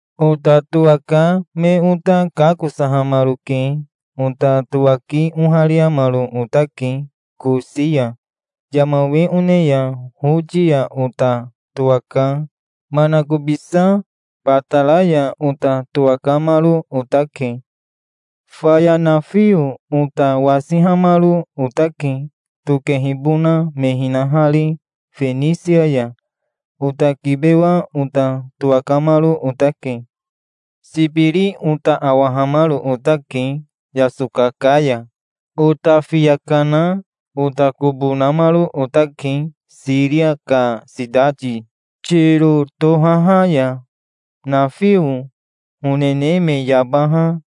Ota towaka me ota kakosahamaroke. Ota towaki ohariamaro otake Kosi ya. Yama we one ya Hoti ya ota towaka manakobisa Batara ya ota towakamaro otake. Faya nafio ota wasihamaro otake tokehibona me hinahari Fenisia ya. Ota kibewa ota towakamaro otake. Sibiri ota awahamaro otake yasoka ka ya. Ota fiya kana ota kobo namaro otake Siria ka sitati Tiro tohaha ya. Nafio honene me yabaha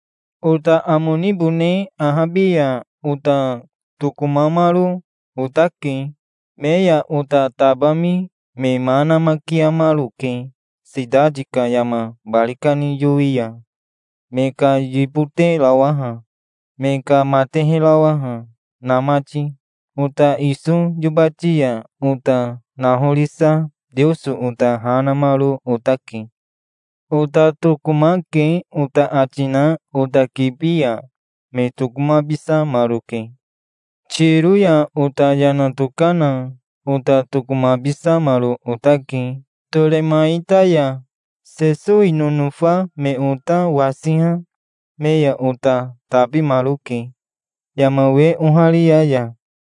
Ota amo nibone ahabi ya ota tokomamaro otake. Me ya ota tabami me ma namakiamaroke sitati ka yama bari kani yowi ya, me ka yiboterawaha, me ka mateherawaha, na mati. Ota iso yobati ya ota nahorisa Teoso ota ha namaro otake. "Ota tokomake", ota ati na ota kibi ya me tokomabisamaroke. Tiro ya ota yana tokana ota tokomabisamaro otake Toremaita ya. Sesowi nonofa me ota wasiha me ya ota tabimaroke yama we oharia ya.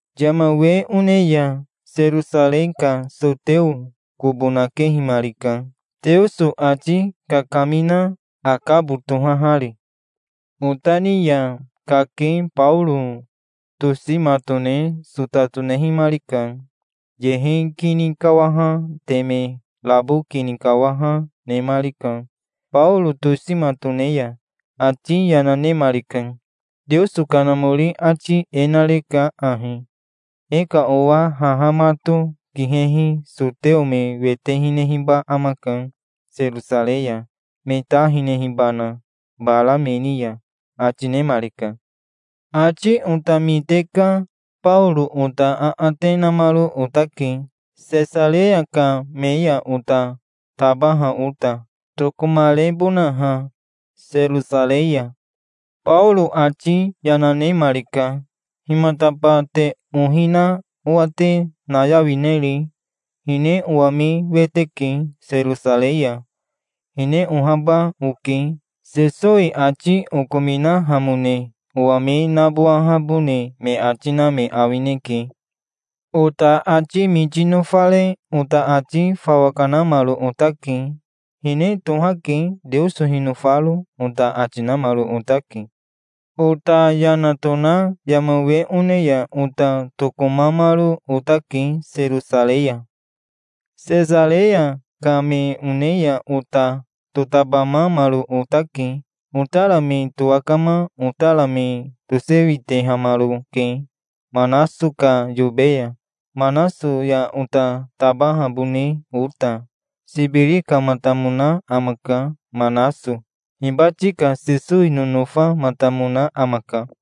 Yama we one ya Serosarei ka soteo kobo nakehimarika, Teoso ati kakamina, Akabo tohahari. Ota ni ya kake Baoro tosi matone sota tonehimarika. Yehe kini kawaha teme rabo kini kawaha, nemarika, Baoro tosi matone ya. Ati yana nemarika. "Teoso Kanamori ati e nareka ahi: 'E ka owa haha mato kihehi soteo me wete hinehiba amaka Serosarei ya, me ta hinehibana bara me ni ya'", ati nemarika. Ati ota mite ka Baoro ota aate namaro otake, Sesareya ka me ya ota tabaha ota, tokomarebonaha Serosarei ya. Baoro ati yana nemarika. "Himataba te ohi na owa te nayawineri? Hine owa me wete ke Serosarei ya. Hine ohaba, oke. Sesowi ati okominahamone owa me nabowahabone me ati na me awineke". Ota ati miti nofare ota ati fawa kanamaro otake. "Hine tohake, Teoso hinofaro", ota ati namaro otake. Ota yana tona yama we one ya ota tokomamaro otake Serosarei ya. Sesareya ka me one ya ota totabamamaro otake. Otara me towakama otara me tosewitehamaroke Manaso ka yobe ya, Manaso ya ota tabahabone ota. Sibiri kamatamona amaka, Manaso. Hibati ka Sesowi nonofamatamona amaka.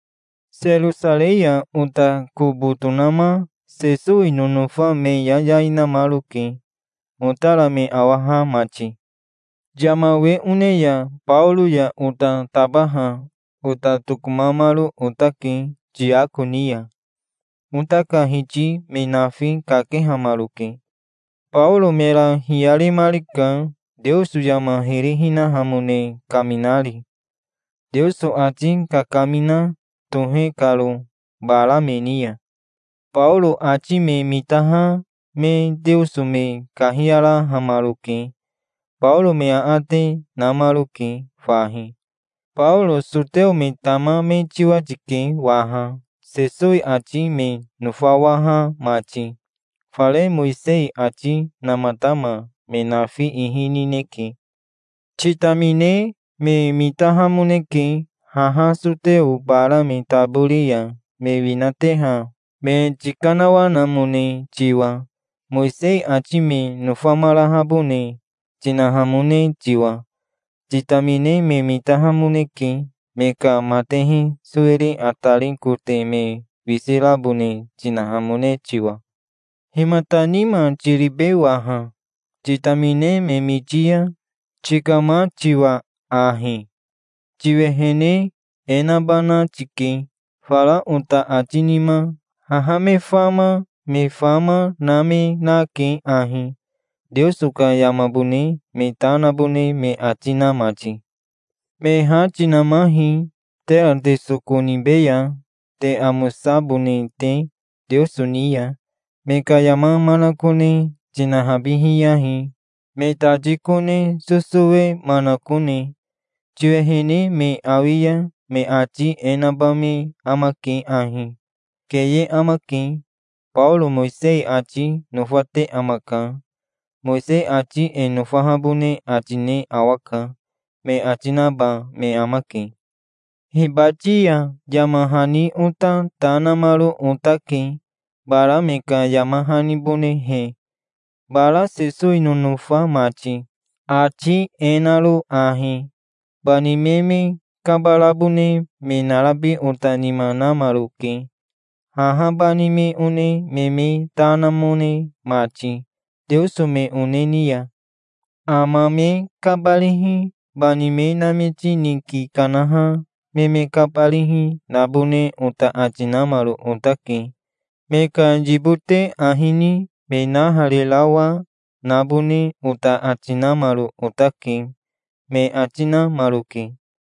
Serosarei ya ota kobo tonama Sesowi nonofa me yayai namaroke, otara me awaha mati. Yama we one ya Baoro ya ota tabaha ota tokahamaro otake Tiako ni ya. Ota ka hiti me nafi kakehamaroke. Baoro mera hiyaremarika, Teoso yama hiri hinahamone kaminari, Teoso ati kakamina tohe karo bara me ni ya. Baoro ati me mitaha me Teoso me kahiyarahamaroke. Baoro me aate namaroke fahi. "Baoro soteo me tama me tiwa tike waha, Sesowi ati me nofawaha mati. Fare Mowisei ati namatama me nafi ihi nineke. Titamine me mitahamoneke, haha soteo bara me tabori ya me winateha me tikanawanamone tiwa, Mowisei ati me nofamarahabone tinahamone tiwa. Titamine me mitahamoneke, me ka matehe sowiri atari kote me wisi rabone tinahamone tiwa. Himata nima tiribe waha, titamine me miti ya, tikama tiwa ahi? Tiwehene e nabana tike, fara ota ati nima. Haha me fama me fama na me nake ahi, Teoso ka yamabone me ta nabone me ati na mati. Me ha tinamahi, tera te soko nibeya, te amosabone te Teoso ni ya. Me ka yama manakone tinahabihiyahi, me tati kone sosowe manakone. Tiwehene me awi ya me ati e naba me amake ahi: 'Keye amake. Baoro Mowisei ati nofate amaka. Mowisei ati e nofahabone ati ne awaka', me ati naba me amake. Hibati ya yama hani ota ta namaro otake bara me ka yama hanibonehe, bara Sesowi nonofa mati, ati e naro ahi: Bani me me kabarabone me narabi ota nima namaroke, haha bani me one me me ta namone mati teoso me one ni ya. Ama me kabarihi, bani me namiti niki kanaha me me kabarihi, nabone ota ati namaro otake. Me ka yibote ahi ni me naharirawa, nabone ota ati, namaro otake", me ati namaroke.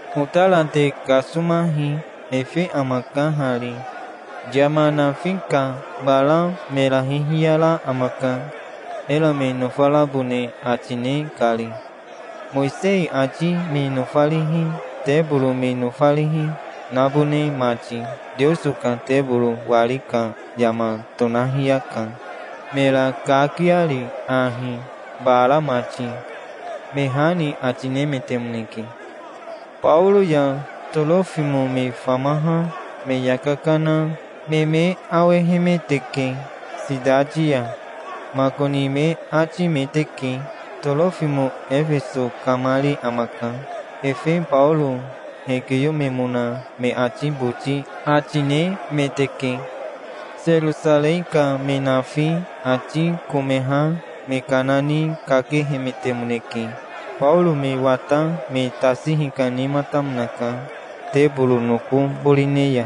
"Otara te kasomahi. Efe amaka hari. Yama nafi ka bara mera hihiyara amaka, era me nofarabone ati ne kari, Mowisei ati me nofarihi, teboro me nofarihi, nabone mati. Teoso ka teboro wari ka yama tonahiyaka, mera kakiari ahi, bara mati", me ha ni ati nemetemoneke. Baoro ya Torofimo me famaha me yaka kana me me awehemeteke sitati ya makoni me atimeteke. Torofimo Efeso kamari amaka. Efe Baoro hekiyomemona me ati boti ati nemeteke. Serosarei ka me nafi ati komeha me kana ni kakehemetemoneke. Baoro me wata me tasi hikanematamonaka teboro noko borone ya.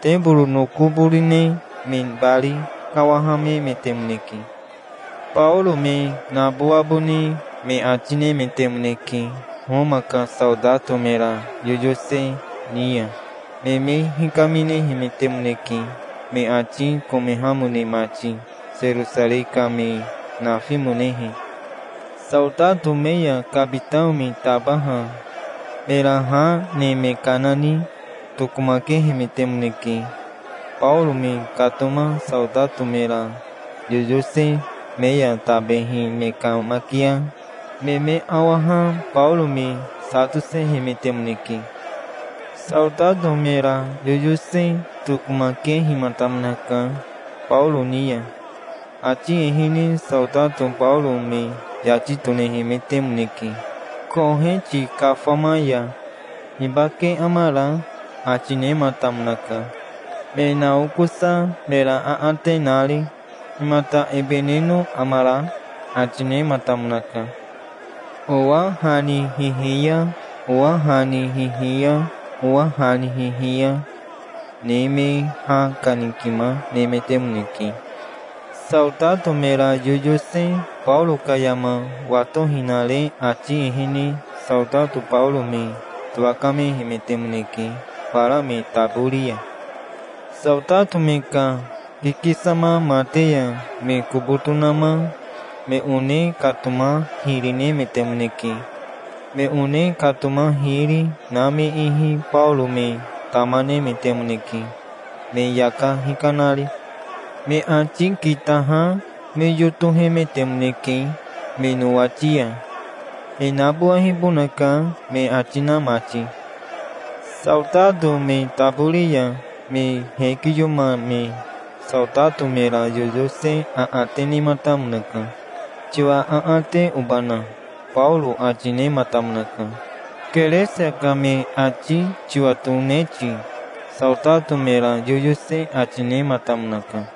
Teboro noko borone me bari kawahamemetemoneke. Baoro me nabowabone me ati nemetemoneke. Homa ka saotato mera yoyose ni ya me me hikaminehemetemoneke, me ati komehamone mati, Serosarei ka me nafimonehe. Saotato me ya kabitao me tabaha mera ha ne me kana ni tokomakehemetemoneke. Baoro me katoma saotato mera yoyose me ya tabehi me kamakia me me awaha Baoro me sa tosehemetemoneke. Saotato mera yoyose tokomakehimatamonaka Baoro ni ya. Ati ehene saotato Baoro me yati tonehemetemoneke koheti kafama ya. "Hibake amara?" ati nematamonaka, me naokosa mera aate nari. "Himata ebe neno amara?" ati, nematamonaka. Owa ha ni hihiya, owa ha ni hihiya, owa ha ni hihiya, ne me ha kanikima nemetemoneke. Saotato mera yoyose Baoro ka yama watohinare ati ehene saotato Baoro me towakamehemetemoneke fara me tabori ya. Saotato me ka kikisama mate ya me kobo tonama me one katoma hiri nemetemoneke. Me one katoma hiri na me ihi Baoro me tama nemetemoneke, me yaka hikanari. Me ati kitaha me yotohemetemoneke me nowati ya, "E nabowehibonaka", me ati na mati. Saotato me tabori ya me hekiyomame saotato mera yoyose aate nematamonaka. "Tiwa aate obana?" Baoro ati nematamonaka. "Keresia ka me ati tiwatone ti?" saotato mera yoyose ati nematamonaka.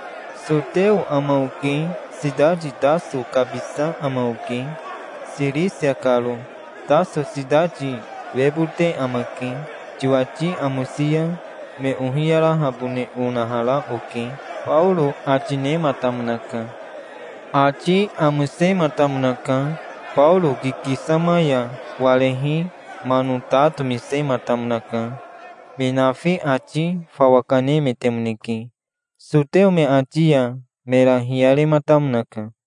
"Soteo ama oke. Sitati Taso kabisa ama oke, Sirisia karo. Taso sitati webote amake. Tiwati amosi ya me ohiyarahabone onahara oke", Baoro ati nematamonaka. Ati amosematamonaka. Baoro kikisama ya warehi mano ta tomisematamonaka. Me nafi ati fawa kanemetemoneke. Soteo me ati ya mera hiyarematamonaka.